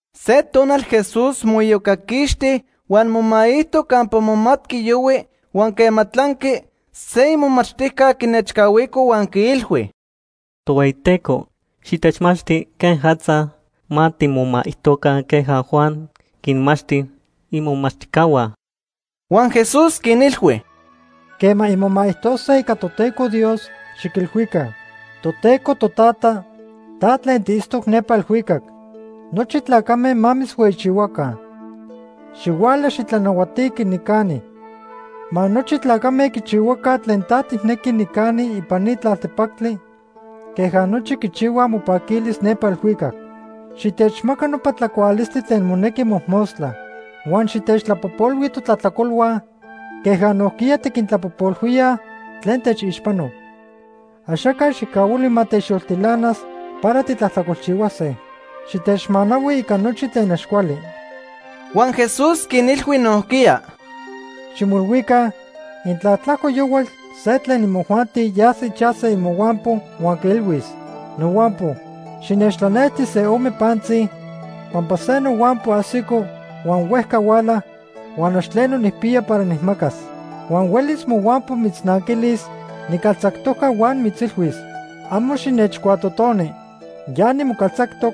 Se tonal Jesús moiyocaquixti huan momaijto campa momatqui yohui huan quema tlanqui, se imomachtijca quinechcahuico huan quiilhui: ―Tohueyiteco, xitechmachti quejatza ma timomaijtoca queja Juan quinmachti imomachtijcahua. Huan Jesús quinilhui: ―Quema inmomaijtose ica Toteco Dios, xiquilhuica: Toteco Totata, ta tlen tiitztoc nepa elhuicac. Nochi tlacame ma mitzhueyichihuaca. Xihuala xitlanahuatiqui nicani. Ma nochi tlacame quichihuaca tlen ta tijnequi nicani ipan ni tlaltepactli, queja nochi quichihuaj mopaquilis nepa elhuicac. Xitechmaca nopa tlacualistli tlen monequi mojmostla. Huan xitechtlapojpolhui totlajtlacolhua, queja nojquiya tiquintlapojpolhuíaj tlen techixpanoj. Axaca xijcahuili ma techyoltilanas para titlajtlacolchihuase. Xitechmanahui ica nochi tlen ax cuali. Huan Jesús quinilhui nojquiya: ―Ximoilhuica intla tlajco yohual se tlen imojuanti yas ichaj se imohuampo huan quiilhuis: ‘Nohuampo, xinechtlanejti se ome pantzi, pampa se nohuampo ajsico huan huejca huala, huan ax tleno nijpiya para nijmacas.’ Huan huelis mohuampo mitznanquilis nicaltzajtoca huan mitzilhuis: ‘Amo xinechcuatotoni. Ya nimocaltzactoc,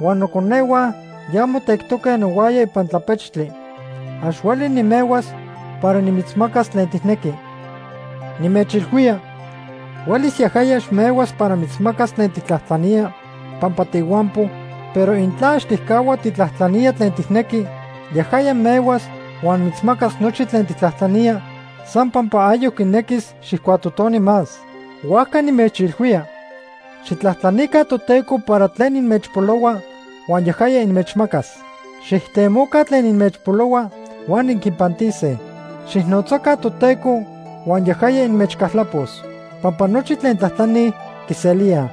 huan noconehua ya motectoque nohuaya ipan tlapechtli. Ax hueli nimehuas para nimitzmacas tlen tijnequi.’ Nimechilhuía, huelis yajaya ax mehuas para mitzmacas tlen tijtlajtlanía pampa tiihuampo, pero intla ax tijcahua tijtlajtlanía tlen tijnequi, yajaya mehuas huan mitzmacas nochi tlen tijtlajtlanía san pampa ayoc quinequis xijcuatotoni más. Huajca nimechilhuía, xijtlajtlanica Toteco para tlen inmechpolohua huan yajaya inmechmacas. Xijtemoca tlen inmechpolohua huan inquipantise. Xijnotzaca Toteco huan yajaya inmechcaltlapos. Pampa nochi tlen tlajtlanij, quiselíaj.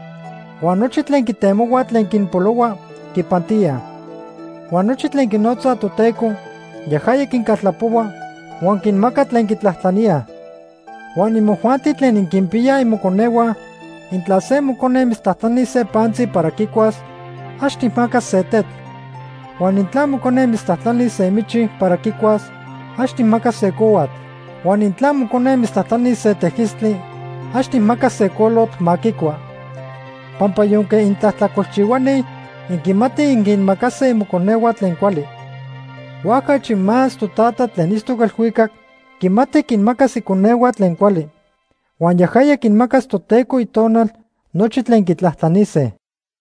Huan nochi tlen quitemohuaj tlen quinpolohua, quipantíaj. Huan nochi tlen quinotzaj Toteco, yajaya quincaltlapohua huan quinmaca tlen quitlajtlaníaj. “Huan imojuanti tlen inquinpiyaj imoconehua, intla se mocone mitztlajtlanis se pantzi para quicuas, ax tijmacas se tetl. Huan intla mocone mitztlajtlanis se michi para quicuas, ax tijmacas se cohuatl. Huan intla mocone mitztlajtlanis se tejquistli, ax tijmacas se colotl ma quicua. Pampa yonque intlajtlacolchihuani, inquimatij inquinmacase imoconehua tlen cuali. Huajca achi más Totata tlen itztoc elhuicac quimati quinmacas iconehua tlen cuali. Huan yajaya quinmacas Toteco Itonal nochi tlen quitlajtlanise.”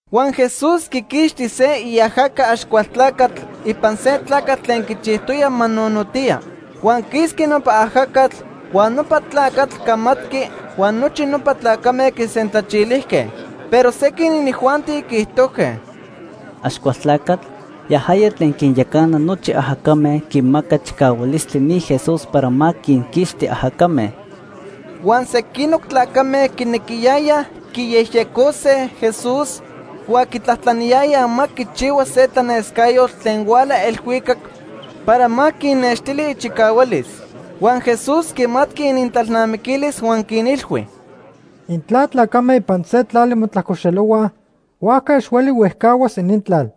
Huan Jesús quiquixti se iajaca Axcualtlacatl ipan se tlacatl tlen quichijtoyaj ma nonotiya. Huan quisqui nopa ajacatl, huan nopa tlacatl camatqui huan nochi nopa tlacame quisentlachilijque. Pero sequin inijuanti quiijtojque: “Axcualtlacatl, yajaya tlen quinyacana nochi ajacame quimaca chicahualistli ni Jesús para ma quinquixti ajacame.” Huan sequinoc tlacame quinequiyayaj quiyejyecose Jesús huan quitlajtlaniyayaj ma quichihua se tlanescayotl tlen huala elhuicac para ma quinnextili ichicahualis. Huan Jesús quimatqui inintlalnamiquilis huan quinilhui: “Intla tlacame ipan se tlali motlajcoxelohuaj, huajca ax hueli huejcahuas inintlal.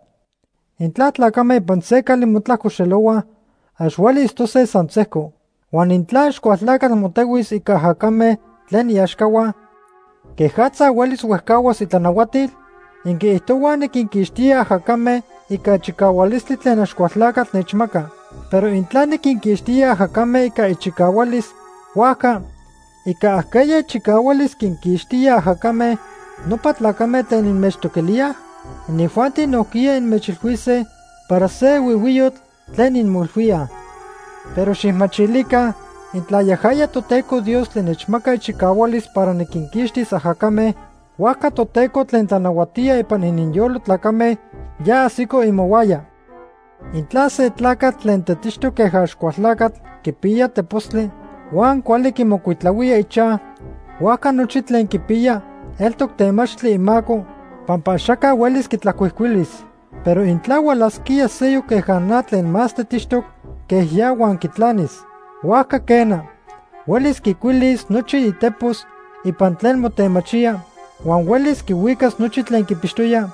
Intla tlacame ipan se cali motlajcoxelohuaj, ax hueli itztose san sejco. Huan intla Axcualtlacatl motehuis ica ajacame tlen iaxcahua, ¿quejatza huelis huejcahuas itlanahuatil? Inquiijtohuaj niquinquixtía ajacame ica chicahualistli tlen Axcualtlacatl nechmaca. Pero intla niquinquixtisquía ajacame ica ichicahualis, huajca ¿ica ajqueya ichicahualis quinquixtíaj ajacame nopa tlacame tlen inmechtoquilíaj? Inijuanti nojquiya inmechilhuise para se huihuiyotl tlen inmoilhuíaj. Pero xijmachilica, intla yajaya Toteco Dios tlen nechmaca ichicahualis para niquinquixtis ajacame, huajca Toteco tlen tlanahuatía ipan ininyolo tlacame ya ajsico imohuaya. “Intla se tlacatl tlen tetixtoc queja Axcualtlacatl quipiya tepostli huan cuali quimocuitlahuía ichaj, huajca nochi tlen quipiya eltoc temachti imaco pampa axaca huelis quitlacuijcuilis. Pero intla hualasquía seyoc queja na tlen más tetixtoc que ya huan quitlanis. Huajca quena, huelis quicuilis nochi itepos ipan tlen motemachía, huan huelis quihuicas nochi tlen quipixtoya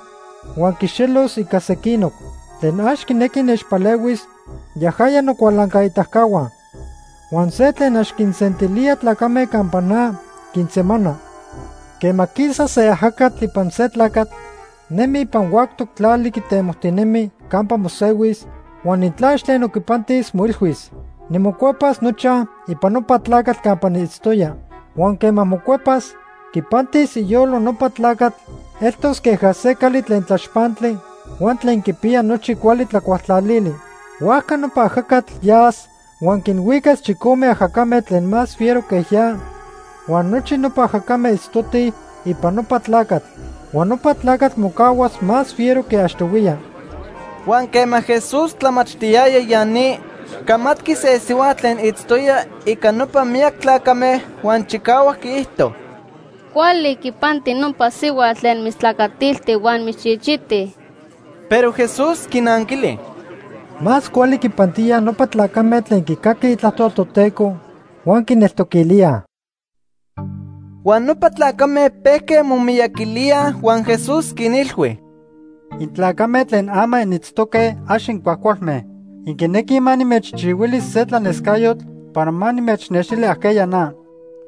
huan quixelos ica sequinoc. “Tlen ax quinequi nechpalehuis, yajaya nocualancaitacahua. Huan se tlen ax quinsentilía tlacame campa na, quinsemana. “Quema quisa se ajacatl ipan se tlacatl, nemi ipan huactoc tlali quitemojtinemi campa mosehuis, huan intla ax tleno quipantis, moilhuis: ‘Nimocuepas nochaj ipan nopa tlacatl campa niitztoya.’ Huan quema mocuepas, quipantis iyolo nopa tlacatl eltos queja se cali tlen tlaxpantli huan tlen quipiya nochi cuali tlacualtlalili. Huajca nopa ajacatl yas huan quinhuicas chicome ajacame tlen más fiero que ya huan nochi nopa ajacame itztotij ipan nopa tlacatl. Huan nopa tlacatl mocahuas más fiero que achtohuiya.” Huan quema Jesús tlamachtiyaya ya ni, camatqui se sihuatl tlen itztoya ica nopa miyac tlacame, huan chicahuac quiijto: ―Cuali quipanti nopa sihuatl tlen mitztlacatilti huan mitzchichiti. Pero Jesús quinanquili: ―Más cuali quipantíaj nopa tlacame tlen quicaquij itlajtol Toteco huan quineltoquilíaj. Huan nopa tlacame pejque momiyaquilíaj huan Jesús quinilhui: ―Intlacame tlen ama initztoque ax incuajcualme. Inquinequij ma nimechchihuili se tlanescayotl para ma nimechnextili ajqueya na.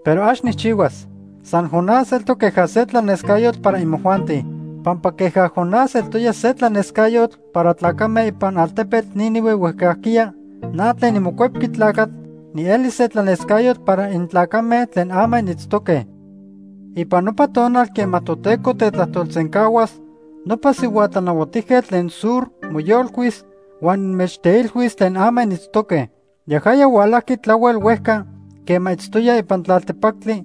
Pero ax nijchihuas. San Jonás eltoc queja se tlanescayotl para imojuanti. Pampa queja Jonás eltoya se tlanescayotl para tlacame ipan altepetl Nínive huejcajquiya, na tlen niMocuepqui Tlacatl nielis se tlanescayotl para intlacame tlen ama initztoque. Ipan nopa tonal quema Toteco tetlajtolsencahuas, nopa sihua tlanahuatijquetl tlen Sur moyolcuis huan inmechteilhuis tlen ama initztoque. Yajaya hualajqui tlahuel huejca quema itztoya ipan tlaltepactli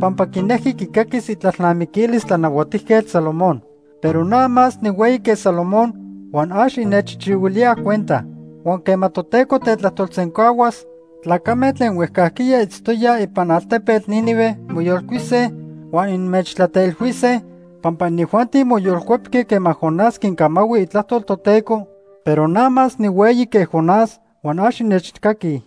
pampa quinejqui quicaquis itlalnamiquilis Tlanahuatijquetl Salomón. Pero na más nihueyi que Salomón huan ax innechchihuilíaj cuenta. Huan quema Toteco tetlajtolsencahuas, tlacame tlen huejcajquiya itztoyaj ipan altepetl Nínive moyolcuise huan inmechtlateilhuise, pampa inijuanti moyolcuepque quema Jonás quincamahui itlajtol Toteco, pero na más nihueyi que Jonás huan ax innechcaquij.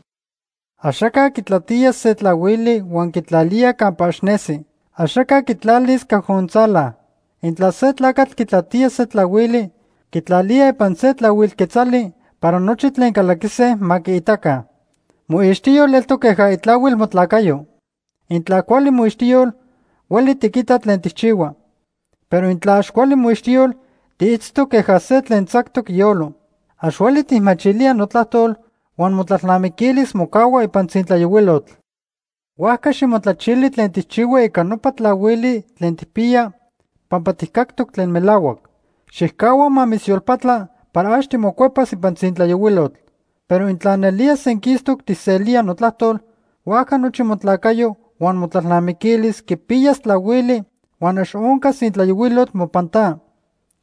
“Axaca quitlatía se tlahuili huan quitlalía campa ax nesi. Axaca quitlalis cajontzala. Intla se tlacatl quitlatía se tlahuili, quitlalía ipan se tlahuil quetzali para nochi tlen calaquise ma quiitaca. Moixtiyol eltoc queja itlahuil motlacayo. Intla cuali moixtiyol, hueli tiquita tlen tijchihua. Pero intla ax cuali moixtiyol, tiitztoc queja se tlen tzactoc iyolo. Ax hueli tijmachilía notlajtol huan motlalnamiquilis mocahua ipan tzintlayohuilotl. Huajca ximotlachili tlen tijchihua ica nopa tlahuili tlen tijpiya pampa tijcactoc tlen melahuac. Xijcahua ma mitzyolpatla para ax timocuepas ipan tzintlayohuilotl. Pero intla nelía senquistoc tijselía notlajtol, huajca nochi motlacayo huan motlalnamiquilis quipiyas tlahuili huan ax oncas tzintlayohuilotl mopan ta.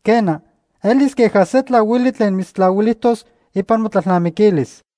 Quena, elis queja se tlahuili tlen mitztlahuilijtos ipan motlalnamiquilis.”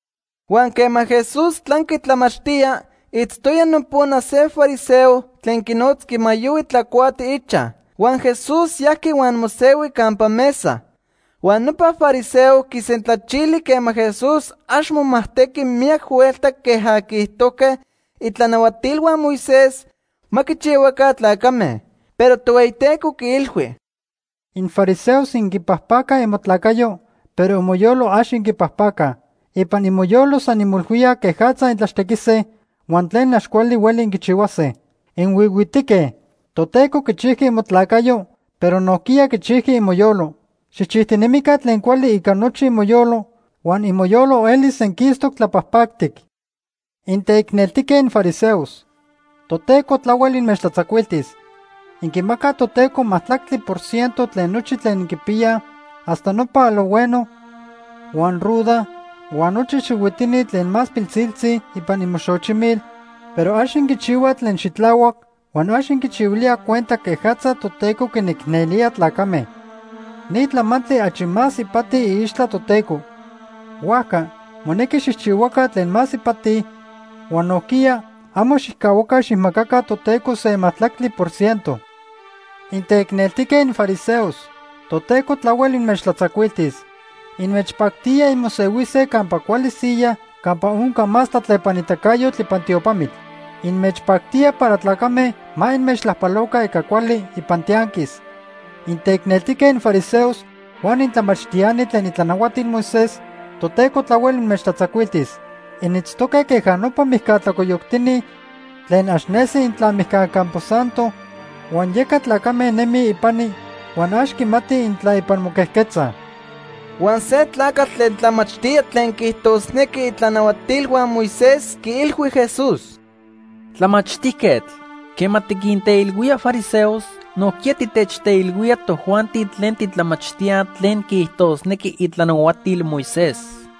Huan quema Jesús tlanqui tlamachtía, itztoya nopona se fariseo tlen quinotzqui ma yohui tlacuati ichaj. Huan Jesús yajqui huan mosehui campa mesa. Huan nopa fariseo quisentlachili quema Jesús ax momajtequi miyac huelta queja quiijtojque itlanahuatilhua Moisés ma quichihuaca tlacame. Pero Tohueyiteco quiilhui: ―Infariseos inquipajpacaj imotlacayo, pero imoyolo ax inquipajpacaj. Ipan imoyolo san inmoilhuíaj quejatza intlaxtequise huan tlen ax cuali hueli inquichihuase. ¡Inhuihuitique! Toteco quichijqui imotlacayo, pero nojquiya quichijqui imoyolo. Xijchijtinemica tlen cuali ica nochi imoyolo huan imoyolo elis senquistoc tlapajpactic. “¡Inteicneltijque infariseos! Toteco tlahuel inmechtlatzacuiltis. Inquimacaj Toteco majtlactli por ciento tlen nochi tlen inquipiyaj hasta nopa alojhueno huan ruda huan nochi xihuitini tlen más pilsiltzi ipan imoxochimil, pero ax inquichihuaj tlen xitlahuac huan ax inquichihuilíaj cuenta quejatza Toteco quinicnelía tlacame. Ni tlamantli achi más ipati iixtla Toteco. Huajca monequi xijchihuaca tlen más ipati huan nojquiya amo xijcahuaca xijmacaca Toteco se majtlactli por ciento. “¡Inteicneltijque infariseos! Toteco tlahuel inmechtlatzacuiltis. Inmechpactía inmosehuise campa cuali siyaj campa onca más tlatlepanitacayotl ipan tiopamitl. Inmechpactía para tlacame ma inmechtlajpaloca ica cuali ipan tianquis. “¡Inteicneltijque infariseos huan intlamachtiani tlen itlanahuatil Moisés! Toteco tlahuel inmechtlatzacuiltis. Initztoque queja nopa mijca tlacoyoctini tlen ax nesi intla mijca campo santo, huan yeca tlacame nemij ipani huan ax quimatij intla ipan moquejquetzaj.” Huan se tlacatl tlen tlamachtía tlen quiijtosnequi itlanahuatilhua Moisés quiilhui Jesús: ―Tlamachtijquetl, quema tiquinteilhuía fariseos, nojquiya titechteilhuía tojuanti tlen titlamachtíaj tlen quiijtosnequi itlanahuatil Moisés.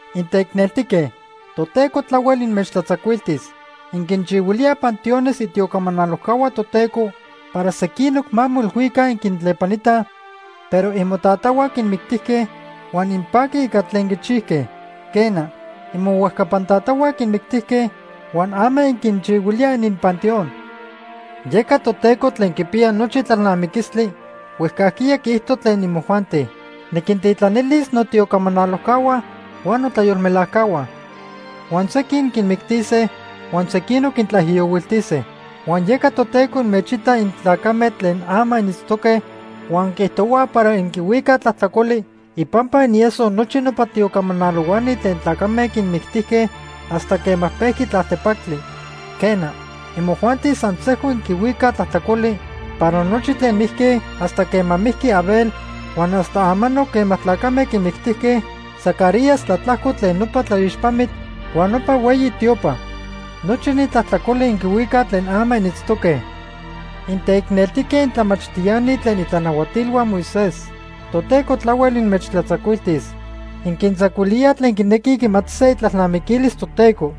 “¡Inteicneltique! Toteco tlahuel inmechtlatzacuiltis. Inquinchihuilíaj panteones itiocamanalojcahua Toteco para sequinoc ma moilhuica inquintlepanitaj, pero imotatahua quinmictijque, huan inpaquij ica tlen quichijque. Quena, imohuejcapan tatahua quinmictijque huan ama inquinchihuilíaj ininpanteón. “Yeca Toteco tlen quipiya nochi tlalnamiquistli huejcajquiya quiijto tlen imojuanti: ‘Niquintitlanilis notiocamanalojcahua huan notlayolmelajcahua. Huan sequin quinmictise huan sequinoc quintlaijiyohuiltise.’ Huan yeca Toteco inmechita intlacame tlen ama initztoque huan quiijtohua para inquihuicaj tlajtlacoli ipampa inieso nochi nopa tiocamanalohuani tlen tlacame quinmictijque hasta quema pejqui tlaltepactli. Quena, imojuanti san sejco inquihuicaj tlajtlacoli para nochi tlen mijque hasta quema mijqui Abel huan hasta amanoc quema tlacame quimictijque Zacarías tlatlajco tlen nopa tlaixpamitl huan nopa hueyi tiopa. Nochi ni tlajtlacoli inquihuicaj tlen ama initztoque. “¡Inteicneltique intlamachtiani tlen itlanahuatilhua Moisés! Toteco tlahuel inmechtlatzacuiltis. Inquintzacuilíaj tlen quinequij quimatise itlalnamiquilis Toteco.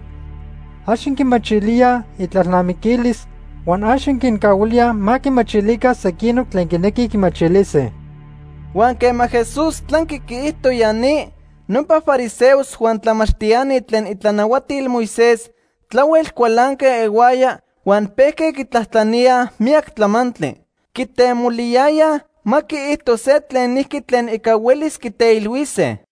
Ax inquimachilíaj itlalnamiquilis huan ax inquincahuilíaj ma quimachilica sequinoc tlen quinequij quimachilise.” Huan quema Jesús tlanqui quiijto ya ni, nopa fariseos huan tlamachtiani tlen itlanahuatil Moisés tlahuel cualanque ihuaya huan pejque quitlajtlaníaj miyac tlamantli. Quitemoliyayaj ma quiijto se tlenijqui tlen ica huelis quiteilhuise.